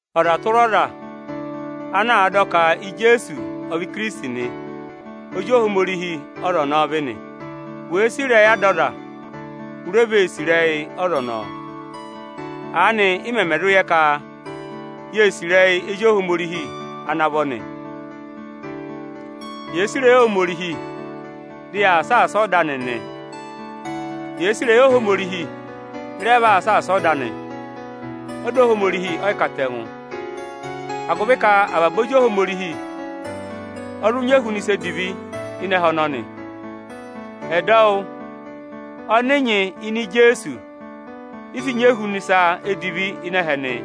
Ọza tụra ọza ana àa dọ ka Ijeesu ọ vị Ikirisiti nị, ozi Ohomorihi ọza ọnọọ vị nị. Wèe sì ịrẹyị ada ọza, u re vee sì ịrẹyị ọza ọnọọ. Aanị ị mẹmẹ zụ yẹ ka yee sì ịrẹyị ezi Ohomorihi ana vọ nị, yèe sì ịrẹyị Ohomorihi, dị yaa saasa ọda anị nị. Yèe sì ịrẹyị Ohomorihi, ị rẹ vaa saasa ọda anị. Ọda Ohomorihi ẹ́ yị katẹngụ, agụvị ka avaba ezi Ohomorihi ẹ zụ nyị ehuna ịsa edivi ịnị ẹhẹ ọnọnị. Ẹdọwụ ọnị nyị ịnị Ijeesu, ị sị nyị ehuna ịsa edivi ịnị ẹhẹ nị.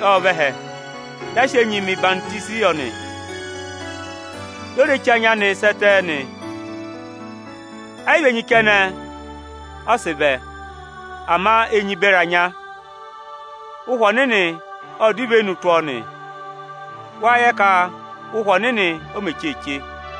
Ijeesu Ikirisiti ọ vẹ ẹhẹ dị a sị enyi mẹ̀ ọyịhwọzenyi yọ nị, dị o re che anya anị sẹ ẹtẹ nị. Ẹ́ yị vị enyi kẹnẹ ọ sị vẹ, ama enyi beri anya. Ụhwẹ Ọnịnị ọ dọ ivenu tụ́ ọ nị, wáa yẹ ka Ụhwẹ Ọnịnị o mē cheeche.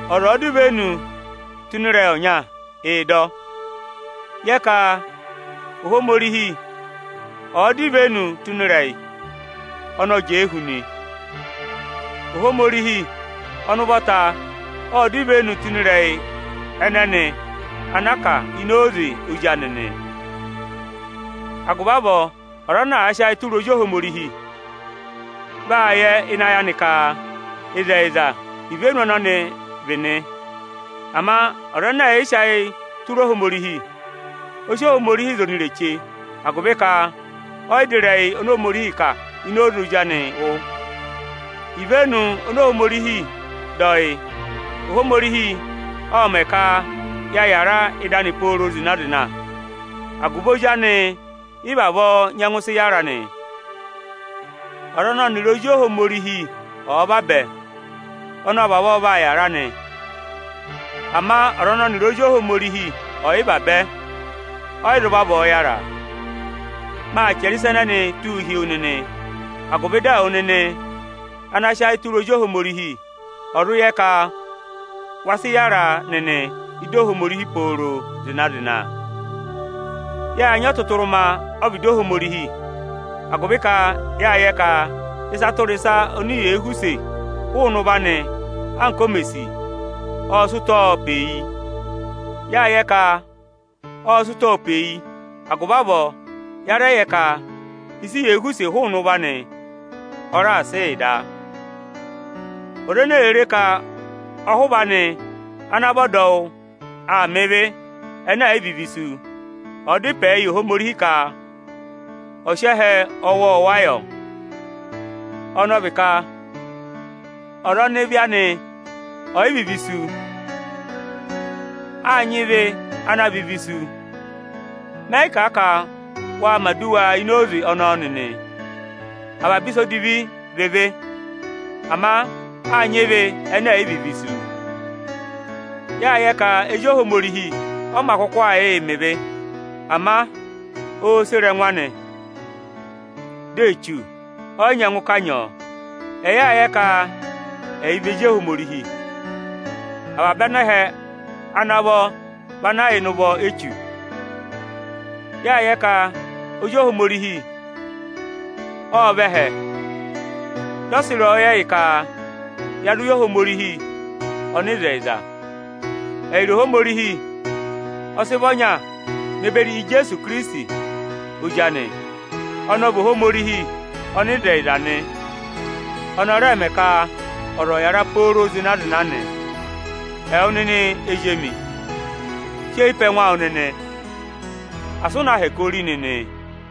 Ọza ọ̀ọ dọ ivenu tụ́ ịnị ịrẹyị ọnya, ịị̄ dọ ọ. Yẹ ka Ohomorihi ọ̀ọ dọ ivenu tụ́ ịnị ịrẹyị, ọnị ọ jẹẹ hu nị. Ohomorihi ọnị ụvọta ọ dọ ivenu tụ́ ịnị ịrẹyị ẹnẹnị ana a kà ịnị oze Ozi anị nị. Agụvị avọọ, ọza ana àa sị ayị tụra Ozi Ohomorihi, vaa yẹ ịnị ayị anị ka ịzẹyịza ívenu ọnọnị vị nị. Ama ọza ẹnẹ ẹ̀ yị sị ayị tụra Ohomorihi, ọ sị Ohomorihi za onireche da, agụvị ka ọ́ yị dọ ịrẹyị ọnị Ohomorihi kà ini oze Ozi anị wụ́. Ivenu oni Ohomorihi dọ yị: Ohomorihi ộ mẹ̀ ka ya yàra ịdị anị pooro zịna-zịna. Agụvị Ozi anị ị vavọọ nyẹngụ sị yára nị. Ọza ịnị ọnịrị Ozi Ohomorihi ọ̀ọ vabẹ, ọnị ọ vavọọ vaa yàra nị. Ama ọza ọnị ọnịrị Ozi Ohomorihi ọ̀ yị vabẹ, ọ́ yị zụ vavọọ yára. Maa chẹrẹ ịsa ẹnẹnịị tụ́ụ hi wu nịnị, agụvị ẹwụ nịnị ana sị ayị tụra Ozi Ohomorihi, ọ̀ zụ yẹ ka wa sị yára nịnị ịdị Ohomorihi pooro zịna-zịna. Yáa nyị ọtụtụrụma ọ́vịdị Ohomorihi, agụvị ka ịsa tụra ịsa oni yèe họ̀ use hụụnị ụvọ anị anka o me sì ọọ̄ sị ụtọọ pe yi. Yáa yẹ ka ọọ̄ sị ụtọọ pe yi, agụvị avọọ ya rẹ yẹ ka ịsị yèe họ̀ use hụụnị ụvọ anị, ọ raà sị yị da. Ọza ene èe re ka ọhụva anị ana vị ọdọwụ aa mẹ ịvị ẹnẹ ẹ̀ yị vị ịvị isu, ọ da ịpẹ yị Ohomorihi ka ọ sị ẹhẹ ọwọọwa yọ; ọnị ọ vị ka ọza ọnị ịvị anị ọ̀ yị vị ịvị isu. Áa nyị ịvị ana vị ịvị isu. Mẹ yị kà a ka wa mẹ̀ aduwa ini oze ọnọọ nịnị. Avaba ịsa edivi vị ịvị, ama áa nyị ịvị ẹnẹ ẹ̀ yị vị ịvị isu. Yáa yẹ ka ezi Ohomorihi ọ mā kụkụ aa yịị mẹ ịvị, ama oō sere ẹngụ anị, dị Echu ọ́ yị nyẹngụ kanyị ọ. Ẹyị áa yẹ ka ẹyị vị ezi Ohomorihi, avaba anẹhẹ ana vọ vị ana yà ịnị ụvọ Echu. Yáa yẹ ka Ozi Ohomorihi ộ vẹ ẹhẹ, dị ọ sị ịrẹyọyẹ yị ka ya zụ yẹ Ohomorihi ọnịzẹyịza nị. Ẹyịrị Ohomorihi ọ sị vị ọnya ne beri Ijeesu Ikirisiti Ozi anị. Ọnị ọ vị Ohomorihi ọnịzẹyịza nị, ọnị ọ rẹẹ̄ mẹ ka ọza ọ̀ yàra pooro zịna-zịna nị. Ẹwụ nịnị ezi emi, si eyi pe ẹngụ awụ nịnị, asị ụ na hẹkẹ ori nịnị o!